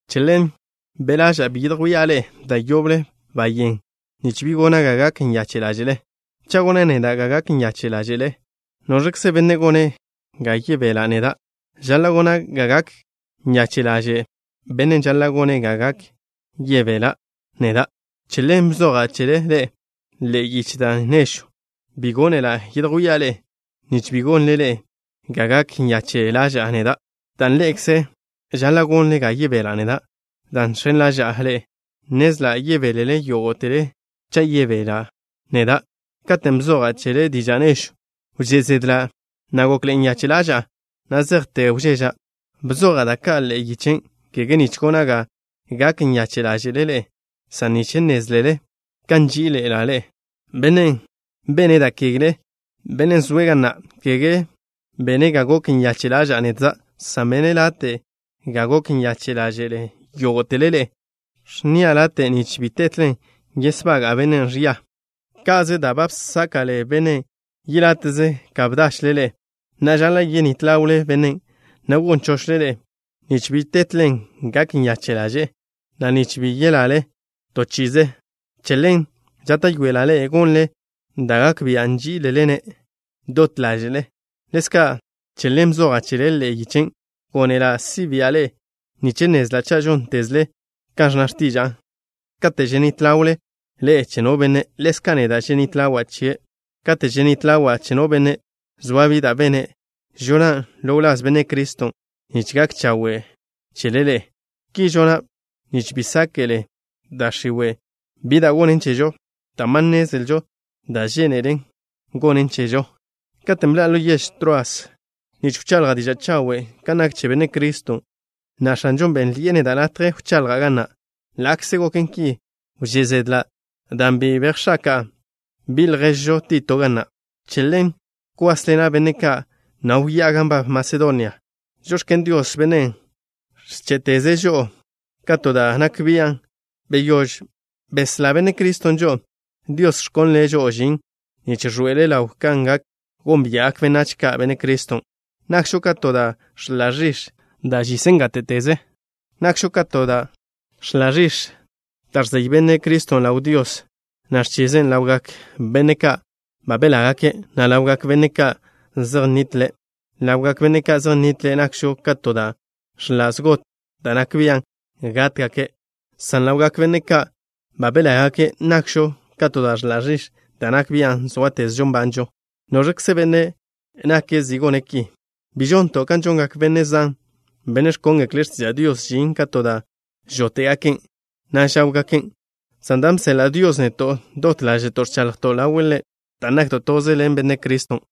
Che ḻen be' ḻaža'a bi yedjwía' ḻe'e da' yoble bayén, nich bi gona' ga gak nyache' ḻáže'le. Cha' gona' neda' ga gak nyache' ḻáže'le ḻe'e, ¿noẕkze benne' gone' ga yebela' neda'? ¿Žaḻa' gona' ga gak nyache' ḻaže' bennen' žaḻa' gone' ga yebela' neda'? Che ḻen bzoja' chele ḻe'e yiche da' nežw. Bi gónela' yedjwía' ḻe'e, nich bi gonle ḻe'e ga gak nyache' ḻaža'a neda', dan' ḻe'ekze žaḻa' gonle ga yebela' neda'. Dan' žx̱en ḻaža'a ḻe'e, nnezla' yebélele yógo'tele cha' yebela' neda'. Katen' bzoja' chele diža' nežwn', wžé' zedla', na' gokḻe'e nyache' ḻaža'a na' zejte wžeža'. Bzoja' da' ka' ḻe'e yichen', kege nich gona' ga gak nyache' ḻáže'le ḻe'e, san nich nnézlele kan nží'iḻe'ela' ḻe'e. Bennen' bene' da' kegle, bennen' zoe' ga na', kege bene' ga gok nyache' ḻaža'a nedza', san bene' late' ga gok nyache' ḻáže'le yógo'tele ḻe'e. Ẕnnia' late' nich bi tetlen yesbaga'a bennen' ẕia. Ka'ze da' ba bsáka'le bennen' yeláte'ze ka bdachle ḻe'e. Na'a, žaḻa' yenít ḻawle bennen', na' gon chochle ḻe', nich bi tetlen gak nyache' ḻaže'e, na' nich bi yeyaḻe' to chi'ize. Che ḻen žáta'yoela' ḻe'e gonle da' gak bia' nží'ilele-ne' dot ḻáže'le. Ḻezka' che ḻen bzoja' chele, ḻe'e yichen'. Gónela' si' bi'a ḻe'e nich nnezla' cha' žóntezle kan ẕnna x̱tiža'a. Kate' ženít ḻawle ḻe'e che no benne', ḻezka' neda' ženít ḻawa' chie'. Kate' ženít ḻawa' che no benne', zoa bi da' bene', žonan' ḻo wláz Benne' Criston' nich gak chawe' chele ḻe'e. Ki žona' nich bi sáke'le da' x̱iwe' bi da' gonen chežo, dan' ba nnezlžo da' žénelen gonen chežo. Katen' bḻa'a ḻo yež Troas nich wchaḻja' diža' chawe' kan nak che Benne' Criston', na' X̱anžon' bénnḻi'e neda' latje wchaḻja' ga na'. Ḻa'kze goken ki, wžé' zedla' dan' bi bejx̱aka'a bi' lježžo Tito ga na'. Che ḻen bkwásḻena' benne' ka', na' wyá'a gan nbab Masedonia. Žox̱ken Dios, Bennen' ẕché'teze' žo'o ka to da' nak bian' beyóž beslá Benne' Criston' žo'o. Dios ẕkonle' žo'o žin nich ẕḻoe'ele' ḻaw kan gak gónbia'gak benách ka' Benne' Criston'. Nakžo ka to da' ẕḻa' ẕix̱, da' žisen gáte'teze. Nakžo ka to da' ẕḻa' ẕix̱, da' ẕzey Benne' Criston' ḻaw Dios, na' ẕchisen' ḻawgak benne' ka' ba belágake', na' ḻawgak benne' ka' zej nnitle'. Ḻawgak benne' ka' zej nnitle' nakžo ka to da' ẕḻa' zgot da' nak bian' gátgake', san ḻawgak benne' ka' ba belágake' nakžo ka to da' ẕḻa' ẕix̱ da' nak bian' sóatezžo nbanžo. ¿Noẕkze benne' nake' zi gone' ki? Bi žonto' kan žongak benne' zan, benne' ẕkóngekle' x̱tiža' Dios žin ka to da' žóte'gaken', na' žá'wgaken', san dan' bseḻa' Dios neto', dot ḻáže'to' ẕchaḻjto' ḻawe' Ḻe', dan' nakto' toze ḻen Benne' Criston'.